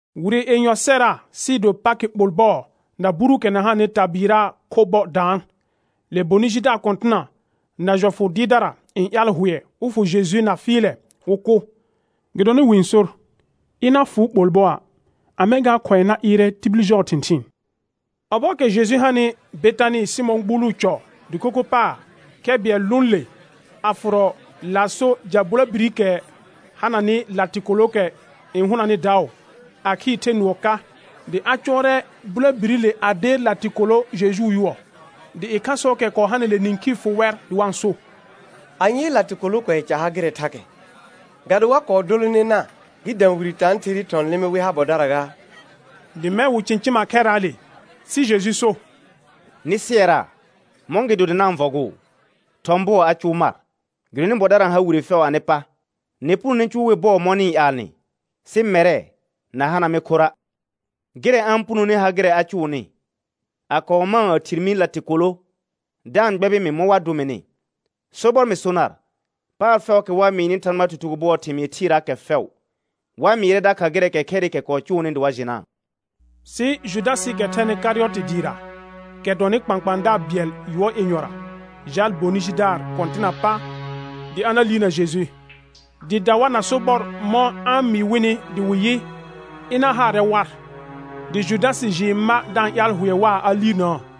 Wire yenyɔ sɛra sɩɩ do Pakɩ ɓol bɔɔ na buruukɛ na hananɩ tabɩɩraa kho bɔ daan. Le bonɩ jidaar kɔ̃tɩna na jɔfʋ dɩɩrdara n ƴaal hʋɛ wɩ fʋ Jeju na fɩɩlɛ wɩ kʋ. Gɩdonɩ wɩ n sor, ɩna fʋʋ ɓol bɔa', a mɛ̃ gaa khʋ̃ɛ na ɩɩrɛ tibil jɔɔ thɩ̃thɩɩn. Ɔbɔɔkɛ Jeju hanɩ Betanɩ Sɩmɔ̃ gbuuluu cɔ dɩko kho paar, khɛ bɩɛl lʋʋn le, a fʋrɔ laaso ja bulabirikɛ hananɩ latɩkolookɛ n hʋnanɩ daʋ, a khɩɩr the nʋɔ ka; dɩ a cʋɔrɛ bulobirile a deer latɩkolo Jejuu yʋɔ. Dɩ ɩkhasɔɔkɛ kɔɔ hanɩle nĩkhii fʋ wɛr dɩ wa-n so: Anyee latɩkolo kʋɛ ca ha gɩrɛ thakɛ? Ga do wa kɔɔ dolonena gɩ dã wire tãatherɩɩ thɔ̃ lɩmɩ wɩ ha bɔdara gaa? Dɩ mɛ̃ wɩ cɩ̃cɩma khɛrraale. Sɩ Jeju so: Nɩ sɩɛraa, mɔ̃gɩdo dɩ na-n vɔgʋʋ? Thɔ̃ bʋɔ a cʋʋ mar; gɩdonɩ bɔdara n har wire fɛʋ anɩ pa, nɩ punone cʋʋ wɩ bɔɔ mɔ̃ nɩ-n ƴaalnɩ, sɩ mɛrɛ na hana mɩ khorra'. Gɩrɛ a-n punoni ha gɩrɛ a cʋʋnɩ, a kɔɔ mãa a thir mi latɩkolo da-n gbɛbɩ mɩ mɔ̃ wa dʋ mɩnɩ. Sobɔr mɩ so nar, paar fɛʋʋkɛ wa mɩɩnɩ Thãgbaa tutugo bʋɔɔ thɩmɩɩ thɩɩraakɛ fɛʋ, wa mɩɩrɛ dakha gɩrɛɛkɛ khɛrɩkɛ kɔɔ cʋʋnɩ dɩ wa jɩnaa. Sɩ Judasɩɩkɛ thɛnɩ Karɩyɔtɩ dɩɩra, kɛ dʋɔnnɩ kpãkpãadaar bɩɛl yʋɔr yenyɔra, jaal bonɩ jidaar kɔ̃tɩnaa pa dɩ a na liirna Jeju. Dɩɩ da war na sobɔr mɔ̃ a-n mɩɩ wɩnɩ dɩ wɩ yɩ, ɩɩɩa haarɛ war. Dɩ Judasɩ jɩɩ ma da-n ƴaal hʋɛ waa a liirnaa.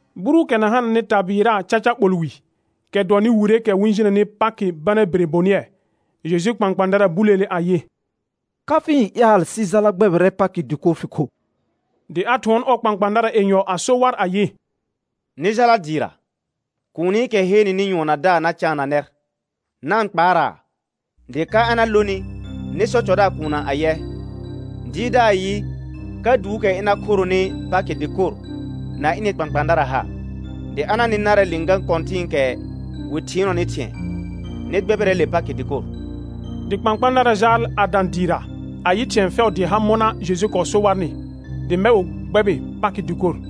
Buruukɛ na hananɩ tabɩɩraa caca ɓol wi, kɛ dʋɔnnɩ wireekɛ wɩ-n jinəni Pakɩ bana bire bonɩɛ, Jejuu kpãkpãadara buleele ayɩ: Ka fɩ-n ƴaal sɩ jala gbɛbɩrɛ Pakɩ dɩkor fɩ kho? Dɩ a thʋɔn ɔɔ kpãkpãadara yenyɔ a so war ayɩ: Nɩ jala dɩɩra, kuunikɛ heenenɩ nyʋɔn na daa na caana nɛr, na-n kpaaraa, dɩ ka a na lonɩ nɩ sɔ cɔdaar kuunna ayɛ: Dɩɩrdaar yɩ, ka duukɛ ɩna khoronɩ Pakɩ dɩkor na ɩnɩ kpãkpãadara ha? Dɩ a na nɩ narɛ lɩ̃gã kɔ̃tɩ̃ɩkɛ wɩ thɩɩnɔnɩ thɩ̃ɛ, nɩ gbɛbɩrɛ le Pakɩ dɩkor. Dɩ kpãkpãadara jaal a dã dɩɩra, a yɩ thɩ̃ɛ fɛʋ dɩɩ ha mɔna Jeju kɔɔ so warnɩ, dɩ mɛ̃ wɩ gbɛbɩ Pakɩ dɩkor.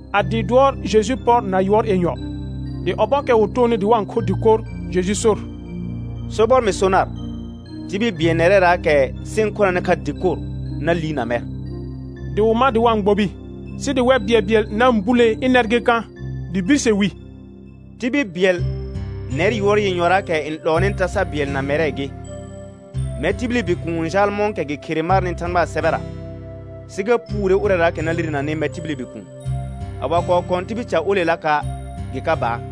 A dɩɩ dʋɔr Jeju pɔr na yʋɔr yenyɔ. Dɩ ɔbɔɔkɛ wɩ toonɩ dɩ wa-n kho dɩkor Jeju sor: Sobɔr mɩ so nar, tibil bɩɛl nɛrɛraakɛ sɩ-n khonanɩ kha dɩkor na liirna mɛr. Dɩ wɩ ma dɩ wa-n gbobi, sɩ dɩ wɛr bɩɛlbɩɛl na-n bulee ɩnɛr gɩ kã? Dɩ birse wi: Tibil bɩɛl nɛr yʋɔr yenyɔraakɛ n 'lɔɔnɩ tasa bɩɛl na mɛrɛ gɩ. Mɛr tibili Bikuun n jaal mɔ̃kɛ gɩ khere marnɩ Thãgbaa sɛbɛra, sɩ ga puure ʋrɛraakɛ na lirenanɩ mɛr tibili Bikuun; a wa kɔɔ kɔ̃ tibil ca olelaka', gɩ ka baar.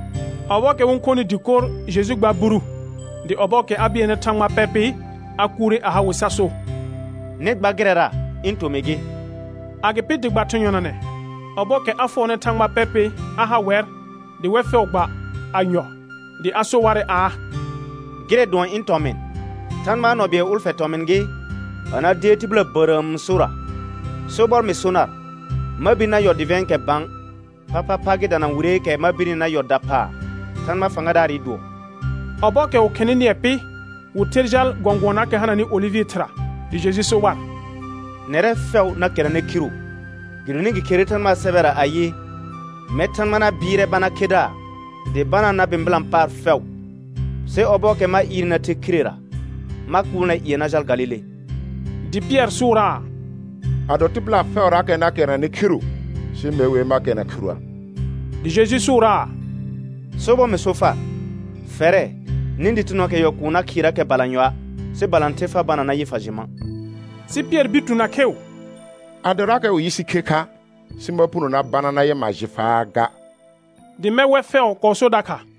Ɔbɔɔkɛ wɩ-n khonɩ dɩkor Jeju gbaar buru, dɩ ɔbɔɔkɛ a bɩɛlnɩ Thãgba pɛr pɩ, a kuure a ha wɩ sa so: Nɩ gba gɩrɛra ɩ̃ tomɩ gɩ. Agɩpɩ dɩ gba thɩ̃ yɔnanɛ, ɔbɔɔkɛ a fʋɔrnɩ Thãgba pɛr pɩ, a ha wɛr, dɩ wɛr fɛʋ gba a yɔ. Dɩ a so warɛ aa: Gɩrɛ dʋɔn ɩ̃ tɔmɩ̃, Thãgbaa nɔ bɩɛl ʋlfɛ tɔmɩ̃ gɩ, a na deer tɩbɩla bərəəm sora. Sobɔr mɩ so nar, ma bir na yɔ dɩvɛ̃ɛkɛ bã, phaphapha gɩ dana wireekɛ ma birni na yɔ daphaa Thãgba fãgadaarɩ dʋɔ. Ɔbɔɔkɛ wɩ khɩnɩ nɩɛ pɩ, wɩ ther jal gɔ̃gʋɔnaakɛ hananɩ olɩvɩ thɩra. Dɩ Jeju so war: Nɛrɛ fɛʋ na kɛrnanɛ khiru, gɩdonɩ gɩ kherere Thãgbaa sɛbɛra ayɩ: «Mɛr Thãgba na bɩɩrɛ bana khedaar dɩ banaa na bɩ̃bɩlã paar fɛʋ.» Sɩ ɔbɔɔkɛ ma ɩɩrnɩ na the khirera ma kʋʋl nɛr ƴɩɛ na jal Galile. Dɩ Pɩɛr sʋʋraa: Ado tɩbɩla fɛʋrakɛ na kɛrnanɛ khiru, sɩ me wer ma kɛrna khiruə'. Dɩ Jeju sʋʋraa: Sobɔr mɩ so far, fɛrɛ, nĩ dɩtɩnɔɔkɛ yɔl kʋʋ na khɩɩrakɛ balanyɔa', sɩ balãther fa bana nayɩ fa jɩ ma'. Sɩ Pɩɛr bir tu na kheu: Adorakɛ wɩ yɩ sɩ khe kha, sɩ ma puno na bana nayɩ ma jɩ faa ga; dɩ mɛ̃ wɛr fɛʋ kɔɔ so dakha.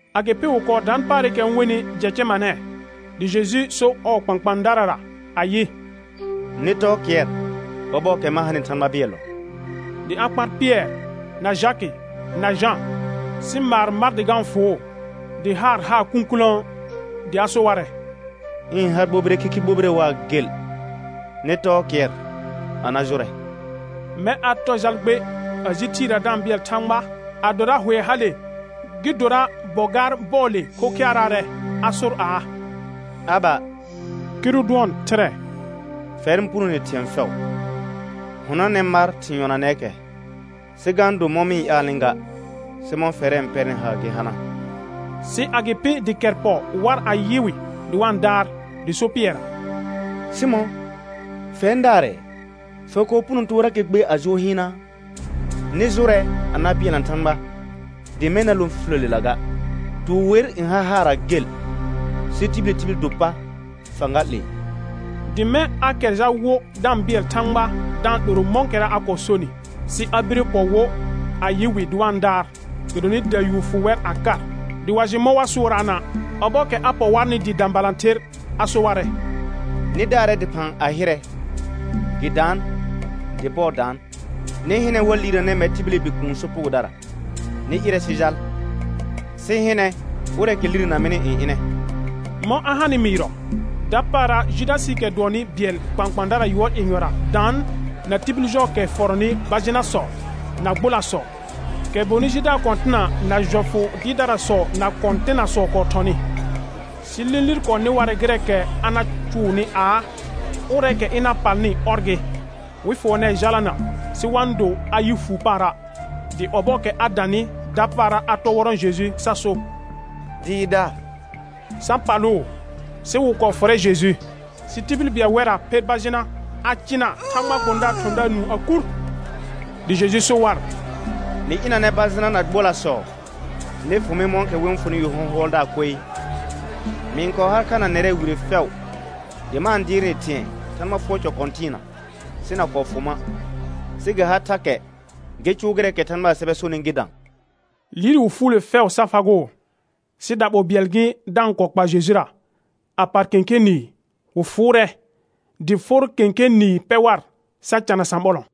Agɩpɩ wɩ kɔɔ daan paarɩkɛ wɩ-n wenɩ Jɛcɛmanɛ, dɩ Jeju so ɔɔ kpãkpãadarara ayɩ: Nɩ tɔɔ kɩɛr ɔbɔɔkɛ ma hanɩ Thãgba bɩɛllɔ. Dɩ a kpar Pɩɛr na Jakɩ na Jã, sɩ maar mar dɩ ga-n fʋʋ, dɩ haar haa kũkulõo. Dɩ a so warɛ: Ɩ̃ ha gbobire khikhi gbobire waa gel, nɩ tɔɔ kɩɛr a na jʋrɛ. Mɛ̃ a tɔ jal gbe, a ji thɩɩra da-n bɩɛl Thãgba adora hʋɛ hale gɩ dora bɔ̃ gaar bɔɔle khokhɩaraarɛ, a sor aa: Aba (kɩrʋ dʋɔn Thɩrɛ), fɛr n punone thɩ̃ɛ fɛʋ, hʋnɔnɛ mar thɩ̃ yɔnanɛɛkɛ sɩ ga do mɔ̃ mɩ-n ƴaalnɩ ga, sɩ mɔ̃ fɛrɛ n pɛrnɩ haar gɩ hana. Sɩ agɩpɩ dɩ kɛr pɔ war a yɩ wɩ dɩ wa-n daar, dɩ so Pɩɛrra: Sɩmɔ̃, fɛr n daarɛɛ? Fa kɔɔ puno toorakɛ gbe a jʋʋr hɩɩnaa? Nɩ jʋrɛ a na bɩɛlna Thãgba dɩ mɛ̃ na lõ fifiləlela ga. Tuur wer n har haarra gel, sɩ tibili tibil do pa fãga 'lee. Dɩ mɛ̃ a kɛr jal wo da-n bɩɛl Thãgba da-n 'loro mɔ̃kɛra a kɔɔ sonɩ. Sɩ a bire pɔ wo, a yɩ wɩ dɩ wa-n daar, gɩdonɩ dayuur fʋ wɛr a kar, dɩ wa jɩ mɔ̃ wa sʋʋraana'. Ɔbɔɔkɛ a pɔ warnɩ dɩɩ dã balãther, a so warɛ: Nɩ daarɛ dɩphã a hɩrɛ; gɩ daan dɩ bɔɔ daan. Nɩ hɩnɛ, wa liirnanɛ mɛr tibili Bikuun sopugodara. Nɩ ɩrɛ sɩ jal, sɩ hɩnɛ ʋrɛɛkɛ lirena mɩnɩ n ɩnɛ. Mɔ̃ a hanɩ mɩɩrɔ, dapaara Judasɩɩkɛ dʋɔnnɩ bɩɛl kpãkpãadara yʋɔr yenyɔra daan na tibil jɔɔkɛ fɔrɔnɩ bajɩnasɔ na gbolasɔ, kɛ bonɩ jidaar kɔ̃tɩna na jɔfʋ dɩɩrdarasɔ na kɔ̃tɩnasɔ kɔɔ thɔnɩ. Sɩ lĩlir kɔɔ nɩ warɛ gɩrɛɛkɛ a na cʋʋnɩ aa, ʋrɛɛkɛ ɩna palnɩ, ɔr gɩ, wɩ fʋɔnɛɛ jalana sɩ wa-n do a yɩ fuu paara'. Dɩ ɔbɔɔkɛ a danɩ, dapaara a tɔ wɔrɔ̃ Jeju sa so: Dɩɩrdaar; sa palʋʋ. Sɩ wɩ kɔɔ fʋrɛ Jeju. Sɩ tibil bɩɛl wɛrra pher bajɩna, a cɩna Thãgbaa gbõdaarɩ thɔ̃daar nũu a kur. Dɩ Jeju so war: Nɩ ɩanɛ bajɩna na gbolasɔ nɩ fʋ mɩ mɔ̃kɛ wɩ-n fʋnɩ yu hɔ̃hʋɔldaar koe. Mɩ-n kɔɔ har kha na nɛrɛ wire fɛʋ dɩ ma-n dɩɩr nɩ thɩ̃ɛ Thãgba fʋɔr cɔ kɔ̃tɩɩna, sɩ na kɔɔ fʋ ma'. Sɩ gɩ har thakɛ gɩ cʋʋ gɩrɛɛkɛ Thãgbaa sɛbɛ sonɩ gɩ dã. Liir wɩ fuule fɛʋ sa fagʋʋ. Sɩ daɓol bɩɛl gɩ da-n kɔɔ kpa Jejura, a par kẽkẽ nɩɩ, wɩ fʋʋrɛ, dɩ for kelẽ nɩɩ pɛ war sa cana sãɓɔlɔ̃.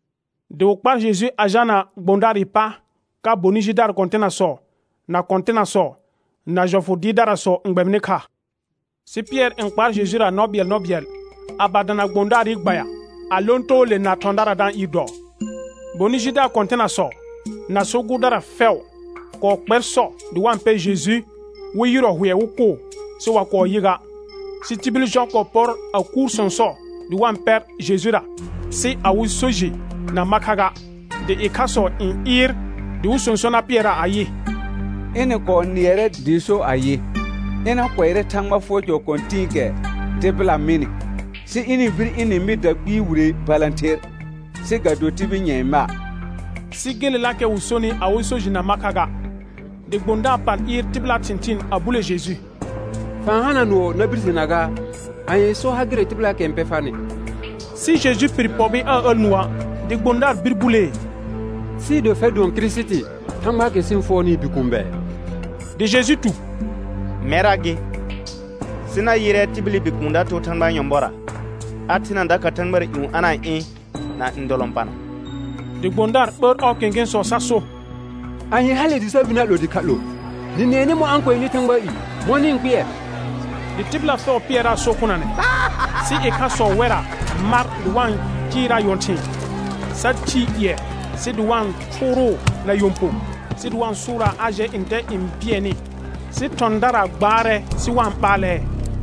Dɩ wɩ kpar Jeju a jalna gbõdaarɩ pa ka bonɩ jidaar kɔ̃tɩnasɔ, na kɔ̃tɩnasɔ, na jɔfʋ dɩɩrdarasɔ n gbɛbɩnɩ kha. Sɩ Pɩɛr n kpaar Jejura nɔ bɩɛl nɔ bɩɛl, a ba dana gbõdaarɩ gbaya, a lõ too le na thɔ̃dara da-n ɩɩr dɔɔ. Bonɩ jidaar kɔ̃tɩnasɔ, na so gʋʋrdara fɛʋ, kɔɔ kpɛr sɔ dɩ wa-n pɛ Jeju wɩ yɩrɔ hʋɛ wɩ kʋʋ, sɩ wa kɔɔ yɩ ga. Sɩ tibil jɔ kɔɔ pɔr a kuur sɔ̃sɔ dɩ wa-n pɛ Jejura, sɩ awɩ so jɩ na ma kha ga. Dɩ ɩkhasɔ n ɩɩr dɩ wɩ sõso na pɩɛraa ayɩ, ɩnɩ kɔɔ nɩɛrɛ dɩ so ayɩ, ɩna kʋɛrɛ Thãgba fʋɔr cɔ kɔ̃tɩ̃ɩkɛ tɩbɩla mɩnɩ, sɩ ɩnɩ-n bir ɩnɩ-n mɩ dakpɩɩ wire balãther, sɩ ga do tibil nyɛ̃ɛ ma'. Sɩ gelelakɛ wɩ sonɩ awɩ so jɩ na ma kha ga. Dɩ gbõdaar pal ɩɩr tɩbɩlaa thɩ̃thɩɩn a bule Jeju: Fa-n hana nʋɔ na birsena gaa? Anyee so ha gɩrɛ tɩbɩlaakɛ n pɛ farnɩ? Sɩ Jeju pɩr pɔbɩ aa əl nʋɔa', dɩ gbõdaar bir bulee: Sɩɩ do fɛr dʋɔn Kirisiti, Thãgbaakɛ sɩ-n fʋɔrnɩɩ Bikuun bɛ? Dɩ Jeju tu: Mɛrra gɩ, sɩ na yɩrɛ tibili Bikuun da too Thãgbaa nyɔ̃bɔra, a thena dakha thãgbara ƴũ a na-n ɩ̃ na ndɔlɔ̃pana. Dɩ gbõdaar ɓəər ɔɔ kẽkẽsɔ sa so: Anye hale dɩ sa bir na 'lo dɩkha 'lo? Nɩ nɩɛnɩ mɔ̃ a kʋɛnɩ Thãgbaa i; mɔ̃ nɩ-n kpɩɛr? Dɩ tɩbɩla fɛʋ pɩɛraa so kʋnanɛ. Sɩ ɩkhasɔ wɛrra mar dɩ wa-n cɩɩraa nyɔ̃thɩ̃ɩ, sa thii ƴɩɛ sɩ dɩ wa-n thʋʋrʋʋ na nyɔ̃ po, sɩ wa-n sʋʋraa a jɛ ntɛ n bɩɛnɩ; sɩ thɔ̃dara gbaarɛ sɩ wa-n ɓaalɛ.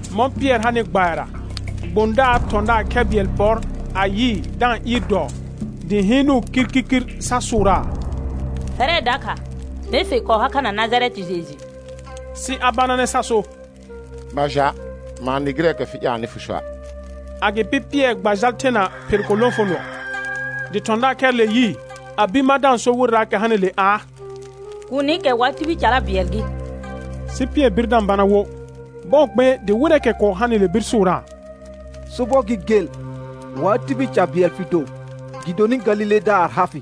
Mɔ̃ Pɩɛr hanɩ gbayara, gbõdaar thɔ̃daar khɛ bɩɛl pɔr a yɩɩ da-n ɩɩr dɔɔ, dɩ hɩɩnʋʋ kirkirkɩr sa sʋʋraa. Fɛrɛ dakha mee fɩ-n kɔɔ ha kha na Najarɛtɩ Jeju. Sɩ a bananɛ sa so: Ma ja', ma-n nɩ gɩrɛɛkɛ fɩ ƴaalnɩ fɩ soa'. Agɩpɩ Pɩɛr gba jal thena phel ko lõfonʋɔ. Dɩ thɔ̃daar khɛrɩle yɩɩ, a bir ma da-n so wɩrɛraakɛ hanɩle aa: Kuunikɛ wa tibil cara bɩɛl gɩ. Sɩ Pɩɛr bir da-n bana wo. Bɔɔ gbe dɩ wɩrɛɛkɛ kɔɔ hanɩle bir sʋʋraa: Sobɔr gɩ gel, wa tibil ca bɩɛl fɩ do gɩdonɩ Galiledaar ha fɩ.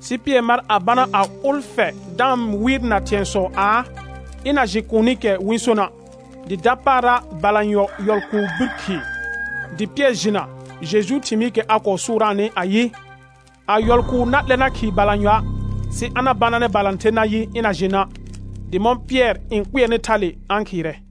Sɩ Pɩɛr mar a bana a ʋlfɛ da-n wɩɩrna thɩ̃ɛsɔ aa, ɩna jɩ kuunikɛ wɩ-n sona'. Dɩ dapaara balanyɔ yɔl kʋʋ bir khɩɩ, dɩ Pɩɛr jɩna Jejuu thɩmɩɩkɛ a kɔɔ sʋʋraanɩ ayɩ, a yɔl kʋʋ na 'lɛ na khɩɩ balanyɔa', sɩ a na bananɛ balãther nayɩ, ɩna jɩ na'. Dɩ mɔ̃ Pɩɛr n kpɩɛrnɩ thale a-n khɩɩrɛ.